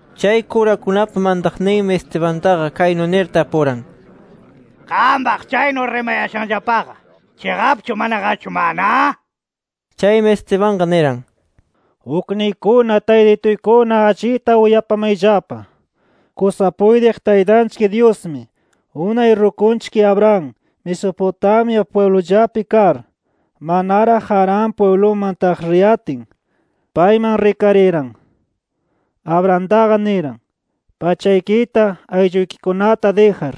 Chay kurakunapa mantaqninmi Estebantaqa kaynu nir tapuran: —Qampaq chaynu rimayashanllapaqa, ¿chiqapchu, manaqachu mana? nir. Chaymi Estebanqa niran: “Ukniykuna, taytituykuna allita uyapamayllapa: Kusa puytiq Taytanchik Dyusmi, unay rukunchik Abraham Mesopotamia pwiblullapi kar, manaraq Harán pwibluman taq riyatin, payman rikariran. Abrahamtaqa niran: ‘Pachaykita, aylluykikunata dijar,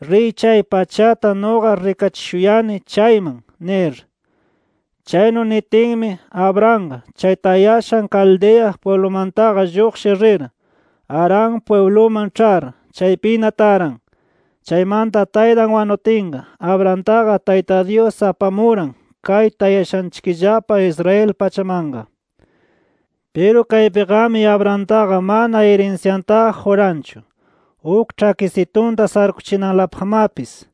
riy chay pachata nuqa rikachishuyani chayman’ nir. Chaynu nitinmi, Abrahamqa chay tayashan Caldea pwiblumantaqa lluqshir rir, Harán pwibluman ĉhar, chaypina taran. Chaymanta taytan wanutinqa, Abrahamtaqa Tayta Dyus apamuran, kay tayashanchikllapa Israel pachamanqa. Piru kaypiqami Abrahamtaqa mana irinsyantaqa quranchu, uk ĉhakisitunta sarukuchinanlapaqmapis.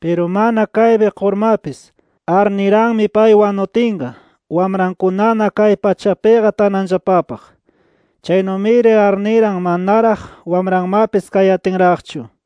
Piru mana kaypi qurmapis, arniranmi pay wanutinqa wamrankunana kay pachapiqa tananllapapaq. Chaynumiri arniran manaraq wamranmapis kayatinraqchu.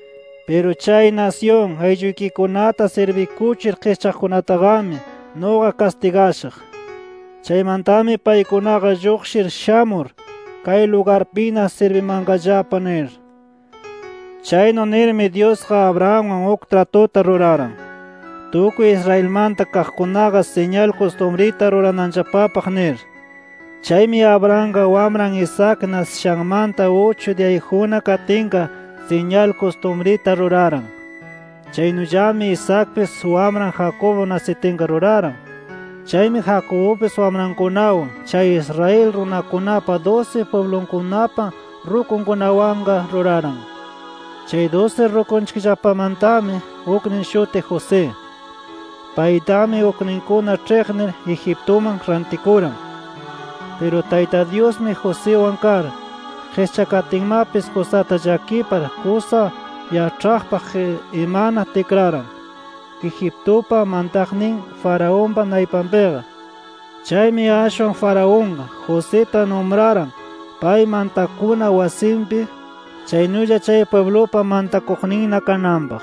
Piru chay nasyun aylluykikunata sirbikuchir qischaqkunataqami nuqa kastigashaq. Chaymantami paykunaqa lluqshir shamur, kay lugarpina sirbimanqallapa’ nir. “Chaynu nirmi Dyusqa Abrahamwan uk tratuta ruraran, tukuy Israelmanta kaqkunaqa siñal kustumrita rurananllapapaq nir. Chaymi Abrahamqa wamran Isaac nasishanmanta uchu diyayjunna katinqa siñal kustumrita ruraran. Chaynullami Isaacpis wamran Jacobo nasitinqa ruraran. Chaymi Jacobupis wamrankunawan chay Israel runakunapa dusi pwiblunkunapa rukunkunawanqa ruraran. “Chay dusi rukunchikllapamantami uknin shutiq José. Paytami ukninkuna ĉhiqnir Egiptuman rantikuran. Piru Tayta Dyusmi, Josiwan kar, qischakatinmapis kusata llakipar kusa yaĉhaqpaq imana tikraran Egiptupa mantaqnin Faraonpa naypanpiqa. Chaymi ashwan Faraonqa, Josita numraran pay mantakuna wasinpi, chaynulla chay pwiblupa mantakuqninna kananpaq.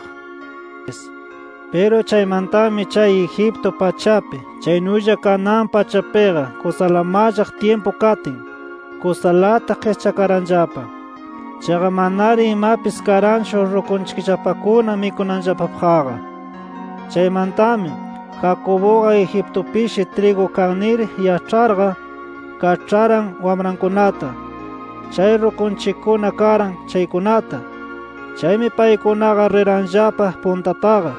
“Piru chaymantami chay Egipto pachapi chaynulla Canaán pachapiqa kusala mallaq tyimpu katin, kusalata qischakaranllapa. Chaqa manari imapis karanchu rukunchikllapakuna mikunanllapapaqqa. Chaymantami, Jacobuqa Egiptupishi trigu kan nir yaĉharqa, kaĉharan wamrankunata, chay rukunchikkuna karan chaykunata. Chaymi paykunaqa riranllapa puntataqa.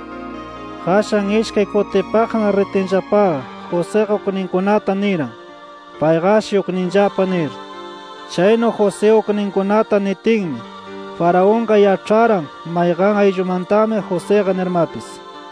Qashan ishkay kutipaqna ritinllapaqa, Josiqa ukninkunata niran, payqashi ukninllapa nir. Chaynu José ukninkunata nitinmi, Faraonqa yaĉharan mayqan ayllumantami Josiqa nirmapis.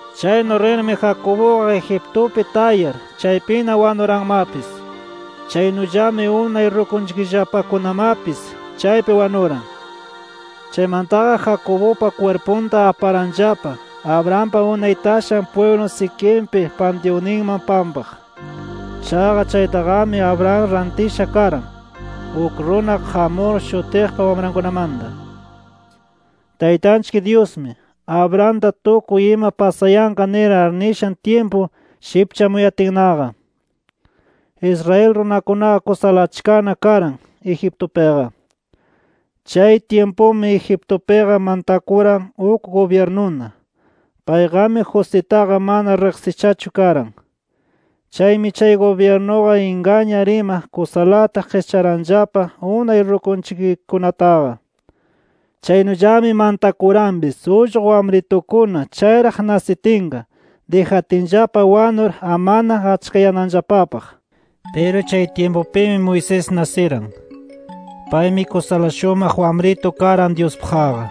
Chaynu rirmi Jacobuqa Egiptupi tayar, chaypina wanuranmapis. Chaynullami unay rukunchikllapakunamapis chaypi wanuran. Chaymantaqa Jacobupa kwirpunta aparanllapa Abrahampa unay tashan pwiblu Siquempi pantyunninman pampaq. Chaqa chaytaqami Abraham rantisha karan, uk runa Hamor shutiqpa wamrankunamanta. “Taytanchik Dyusmi, Abrahamta tukuy ima pasayanqa nir arnishan tyimpu shipchamuyatinnaqa, Israel runakunaqa kusala achkana karan Egiptupiqa. Chay tyimpumi Egiptupiqa mantakuran uk gubyirnuna. Payqami Jositaqa mana riqsishachu karan. Chaymi chay gubyirnuqa ingañar ima kusalata qischaranllapa unay rukunchikkunataqa. Chaynullami mantakuranpis ullqu wamritukuna chayraq nasitinqa, dijatinllapa wanur amana achkayananllapapaq. “Piru chay tyimpupimi Moisés nasiran. Paymi kusala shumaq wamritu karan Dyuspaqqa.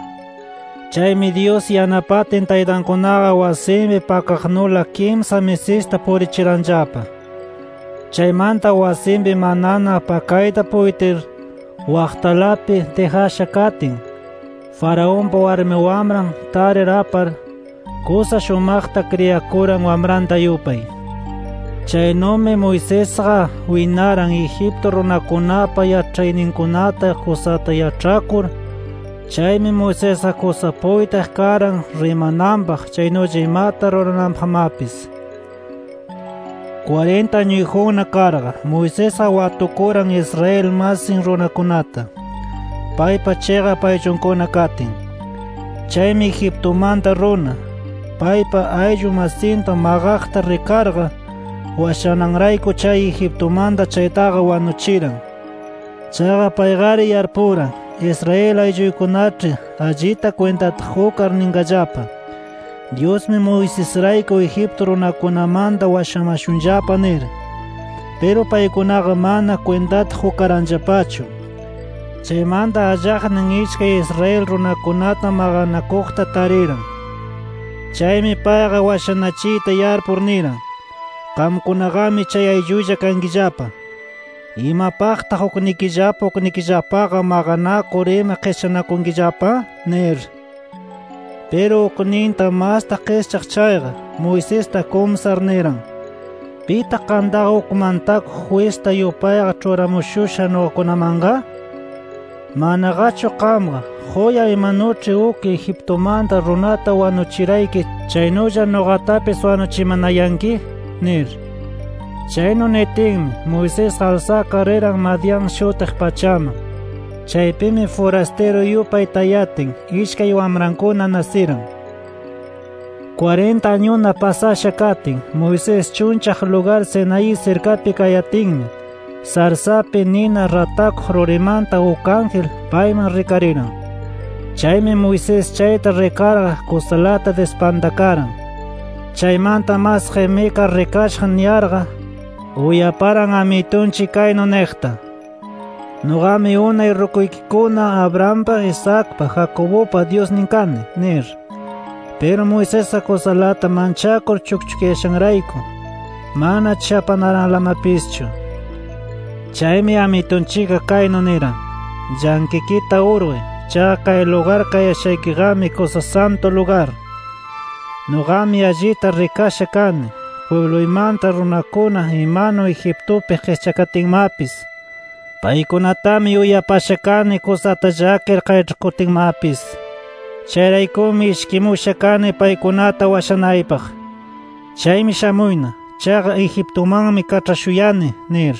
Chaymi Dyus yanapatin taytankunaqa wasinpi pakaqnula kimsa misista purichiranllapa. Chaymanta wasinpi manana pakayta puytir waqtalapi dijasha katin, Faraonpa warmi wamran tarir apar, kusa shumaqta kriyakuran wamranta yupay. Chaynumi Moisesqa winaran Egipto runakunapa yaĉhayninkunata kusata yaĉhakur. Chaymi Moisesqa kusa puytiq karan rimananpaq, chaynulla imata rurananpaqmapis. “Kwarinta añuyjunna karqa, Moisesqa watukuran Israel masin runakunata, paypa chiqap ayllunkuna katin. Chaymi Egiptumanta runa, paypa ayllu masinta maqaqta rikarqa, washananrayku chay Egiptumanta chaytaqa wanuchiran. Chaqa payqari yarpuran, Israel aylluykunaĉhi allita kwintata qukar ninqallapa: ‘Dyusmi, Moisesrayku Egipto runakunamanta washamashunllapa’ nir. Piru paykunaqa mana kwintata qukaranllapachu. Chaymanta, allaqnin ishkay Israel runakunata maqanakuqta tariran. Chaymi payqa washanachiyta yarpur niran: ‘Qamkunaqami chay ayllulla kankillapa, ¿imapaqtaq uknikillapa uknikillapaqa maqanakur ima qischanakunkillapa?’ nir. “Piru ukninta masta qischaq chayqa, Moisesta kumsar niran: ‘¿Pitaq qamtaqa uk mantakuq jwista yupayqa ĉhuramushusha nuqakunamanqa? ¿Manaqachu qamqa, quya imanuĉhi uk Egiptumanta runata wanuchirayki, chaynulla nuqatapis wanuchimanayanki?’ nir. Chaynu nitinmi, Moisesqa alsakar riran Madián shutiq pachaman. Chaypimi furastiru yupay tayatin, ishkay wamrankuna nasiran. “Kwarinta añuna pasasha katin Moisés chunllaq lugar Sinaí sirkapi kayatinmi, sarsapi nina ratakuq rurimanta uk ángel payman rikariran. Chaymi Moisés chayta rikarqa kusalata dispantakaran. Chaymanta mas qimikar rikashaq niyarqa, uyaparan Amitunchik kaynu niqta: ‘Nuqami unay rukuykikuna Abrahampa, Isaacpa, Jacobupa Dyusnin kani’ nir. Piru Moisesqa kusalata manchakur chukchukyashanrayku, mana chapanaranlamapischu. Chaymi Amitunchikqa kaynu niran: ‘Llanqikita urquy. Chaqa kay lugar kayashaykiqami, kusa santu lugar. Nuqami allita rikasha kani pwibluymanta runakuna imanu Egiptupi qischakatinmapis. Paykunatami uyapasha kani kusata llakir qayĉhakutinmapis. Chayraykumi ishkimusha kani paykunata washanaypaq. Chaymi shamuyna. Chaqa Egiptumanmi kaĉhashuyani’ nir.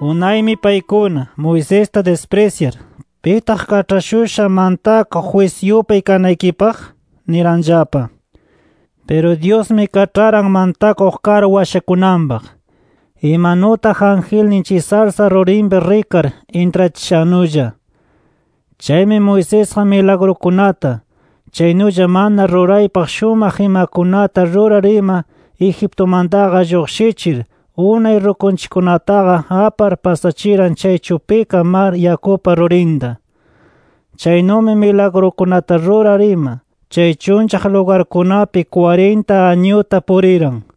“Unaymi paykuna, Moisesta disprisyar ‘¿Pitaq kaĉhashusha mantakuq jwis yupay kanaykipaq?’ niranllapa. Piru Dyusmi kaĉharan mantakuq kar washakunanpaq, imanutaq angelnin chay sarsa rurinpi rikar intrachishannulla. Chaymi Moisesqa, milagrukunata, chaynulla mana ruraypaq shumaq imakunata rurar ima Egiptumantaqa lluqshichir unay rukunchikkunataqa apar pasachiran chay chupika mar yakupa rurinta. Chaynumi milagrukunata rurar ima, chay chunllaq lugarkunapi kwarinta añuta puriran.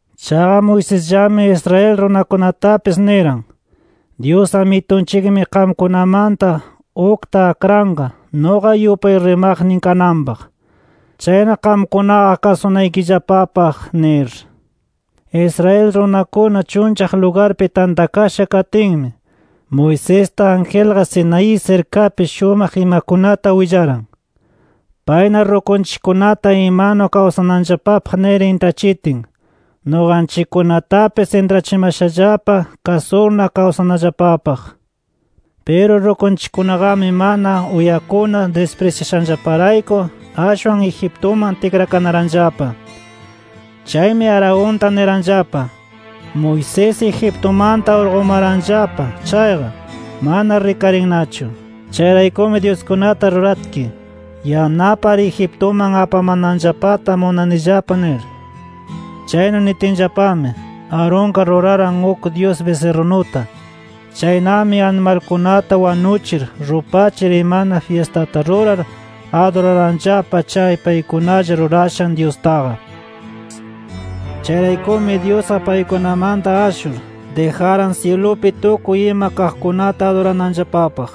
Chaqa Moisesllami Israel runakunatapis niran: ‘Dyus Amitunchikmi qamkunamanta ukta akranqa nuqa yupay rimaqnin kananpaq. Chayna qamkunaqa kasunaykillapapaq’ nir. “Israel runakuna chunllaq lugarpi tantakasha katinmi, Moisesta, angelqa Sinaí sirkapi shumaq imakunata willaran. Payna rukunchikkunata imanu kawsananllapapaq nir intrachitin, nuqanchikkunatapis intrachimashallapa kasurna kawsanallapapaq. “Piru rukunchikkunaqami mana uyakunar disprisyashanllaparayku ashwan Egiptuman tikrakanaranllapa. Chaymi Aaronta niranllapa: ‘Moisés Egiptumanta urqumaranllapa chayqa, mana rikarinnachu. Chayraykumi dyuskunata ruratki, yanapar Egiptuman apamananllapata munanillapa’ nir. Chaynu nitinllapami, Aaronqa ruraran uk dyus bisirrunuta. Chaynami animalkunata wanuchir, rupachir imana fyistata rurar aduraranllapa chay paykunalla rurashan dyustaqa. Chayraykumi Dyusqa paykunamanta ashur, dijaran syilupi tukuy ima kaqkunata adurananllapapaq.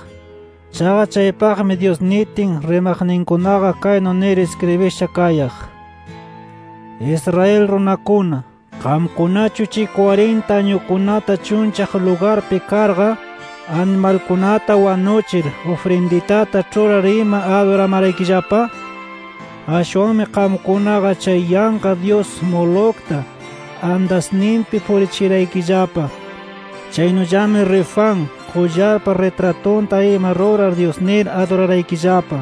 Chaqa chaypaqmi Dyus nitin, rimaqninkunaqa kaynu nir iskribisha kayaq: ‘Israel runakuna, ¿qamkunachu chay kwarinta añukunata chunllaq lugarpi karqa, animalkunata wanuchir, ufrinditata ĉhurar ima aduramaraykillapa? Ashwanmi qamkunaqa chay yanqa dyus Molocta andasninpi purichiraykillapa. Chaynullami Refán qullarpa ritratunta ima rurar dyus nir aduraraykillapa.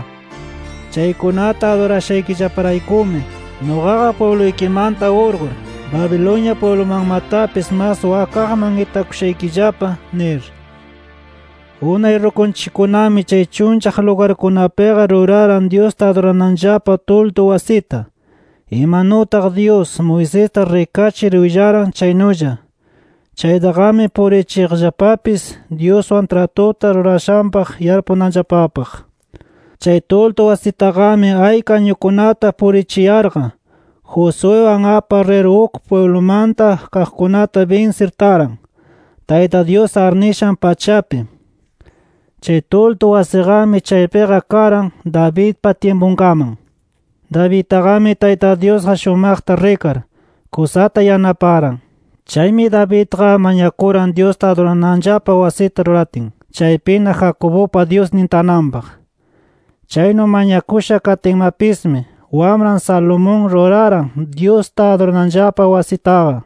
Chaykunata adurashaykillaparaykumi, nuqaqa pwibluykimanta urqur, Babilonia pwiblumanmatapis mas wakaqman itakushaykillapa’ nir. “Unay rukunchikkunami chay chunllaq lugarkunapiqa ruraran Dyusta adurananllapa tuldu wasita, imanutaq Dyus, Moisesta rikachir willaran chaynulla. Chaytaqami purichiqllapapis Dyuswan tratuta rurashanpaq yarpunanllapapaq. Chay tuldu wasitaqami ayka añukunata purichiyarqa, Josuewan apar rir uk pwiblumanta kaqkunata binsir taran, Tayta Dyus arnishan pachapi. Chay tuldu wasiqami chaypiqa karan Davidpa tyimpunkaman. “Davidtaqami Tayta Dyusqa shumaqta rikar, kusata yanaparan. Chaymi Davidqa mañakuran Dyusta adurananllapa wasita ruratin, chaypina Jacobupa Dyusnin tananpaq. Chaynu mañakusha katinmapismi, wamran Salomón ruraran Dyusta adurananllapa wasitaqa.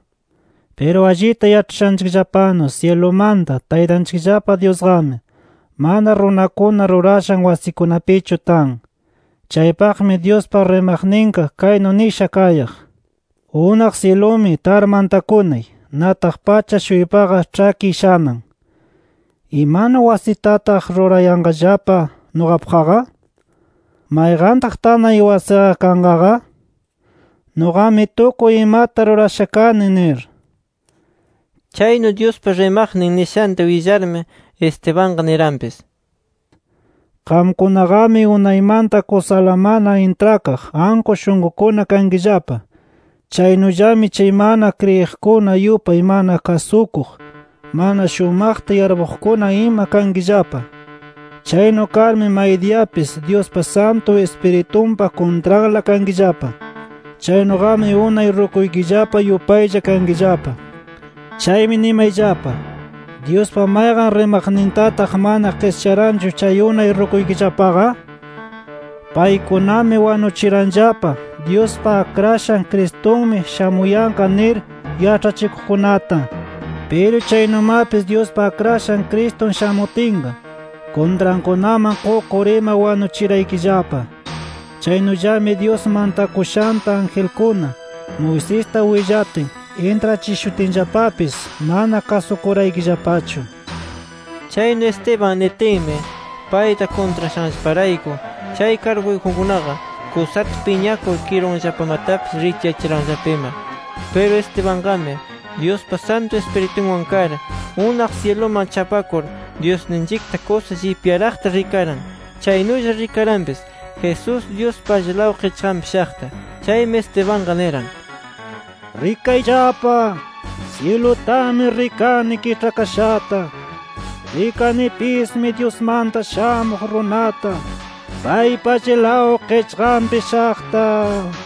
Piru allita yaĉhashanchikllapanu syilumanta Taytanchikllapa Dyusqami, mana runakuna rurashan wasikunapichu tan. Chaypaqmi Dyuspa rimaqninqa kaynu nisha kayaq: ‘Unaq syilumi, tar mantakunay. Nataq pacha-shuypaqa ĉhakiy shanan. ¿Imanu wasitataq rurayanqallapa nuqapaqqa? ¿Mayqantaq tanay wasiqa kanqaqa? Nuqami tukuy imata rurasha kani’ nir”. Chaynu Dyuspa rimaqnin nishanta willarmi, Estebanqa niranpis: “Qamkunaqami unaymanta kusala mana intrakaq, anku shunqukuna kankillapa. Chaynullami chay mana kriyiqkuna yupay mana kasukuq, mana shumaqta yarpuqkuna ima kankillapa. Chaynu karmi maydiyapis Dyuspa Santu Ispiritunpa kuntranla kankillapa. Chaynuqami unay rukuykillapa yupaylla kankillapa. Chaymi nimayllapa, ¿Dyuspa mayqan rimaqnintataq mana qischaranchu chay unay rukuykillapaqa? Paykunami, wanuchiranllapa Dyuspa Akrashan Cristunmi shamuyanqa nir yaĉhachikuqkunata. Piru chaynumapis Dyuspa Akrashan Cristun shamutinqa, kuntrankunaman qukur ima wanuchiraykillapa. Chaynullami Dyus mantakushanta angelkuna, Moisesta willatin, intrachishutinllapapis mana kasukuraykillapachu” nir. Chaynu Esteban nitinmi, payta kuntrashanllaparayku chay karguyjunkunaqa kusata piñakur kirunllapamatapis richyachiranllapa ima. Piru Estebanqami, Dyuspa Santu Ispiritunwan kar, unaq syiluman chapakur, Dyusninchikta kusa llipyaraqta rikaran. Chaynulla rikaranpis Jesús, Dyuspa allilaw qichqanpi shaqta. Chaymi Estebanqa niran: —¡Rikayllapa! ¡Syilutami rikani kiĉhakashata! Rikanipismi Dyusmanta Shamuq Runata paypa allilaw qichqanpi shaqta nir.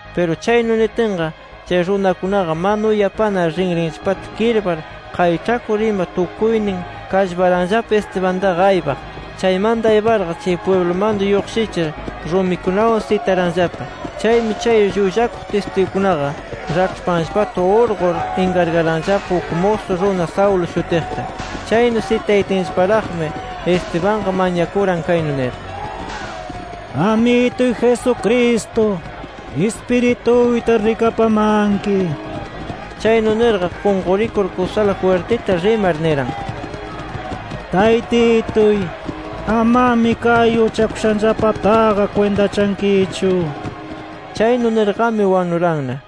Piru chaynu nitinqa, chay runakunaqa mana uyapanar rinrinllapata kirpar, qayĉhakur ima, tukuynin kallparanllapa Estebantaqa aypaq. Chaymanta ayparqa, chay pwiblumanta lluqshichir, rumikunawan sitaranllapa. Chaymi chay llullakuq tistigukunaqa raĉhpanllapata urqur inkargaranllapa uk musu runa Saulo shutiqta. Chaynu sitayatinllaparaqmi, Estebanqa mañakuran kaynu nir: “Amituy Jesucristo, ispirituyta rikapamanki”. Chaynu nirqa, qunqurikur kusala jwirtita rimar niran: “Taytituy, amami kay uchakushanllapataqa kwintachankichu” nir. Chaynu nirqami, wanuranna.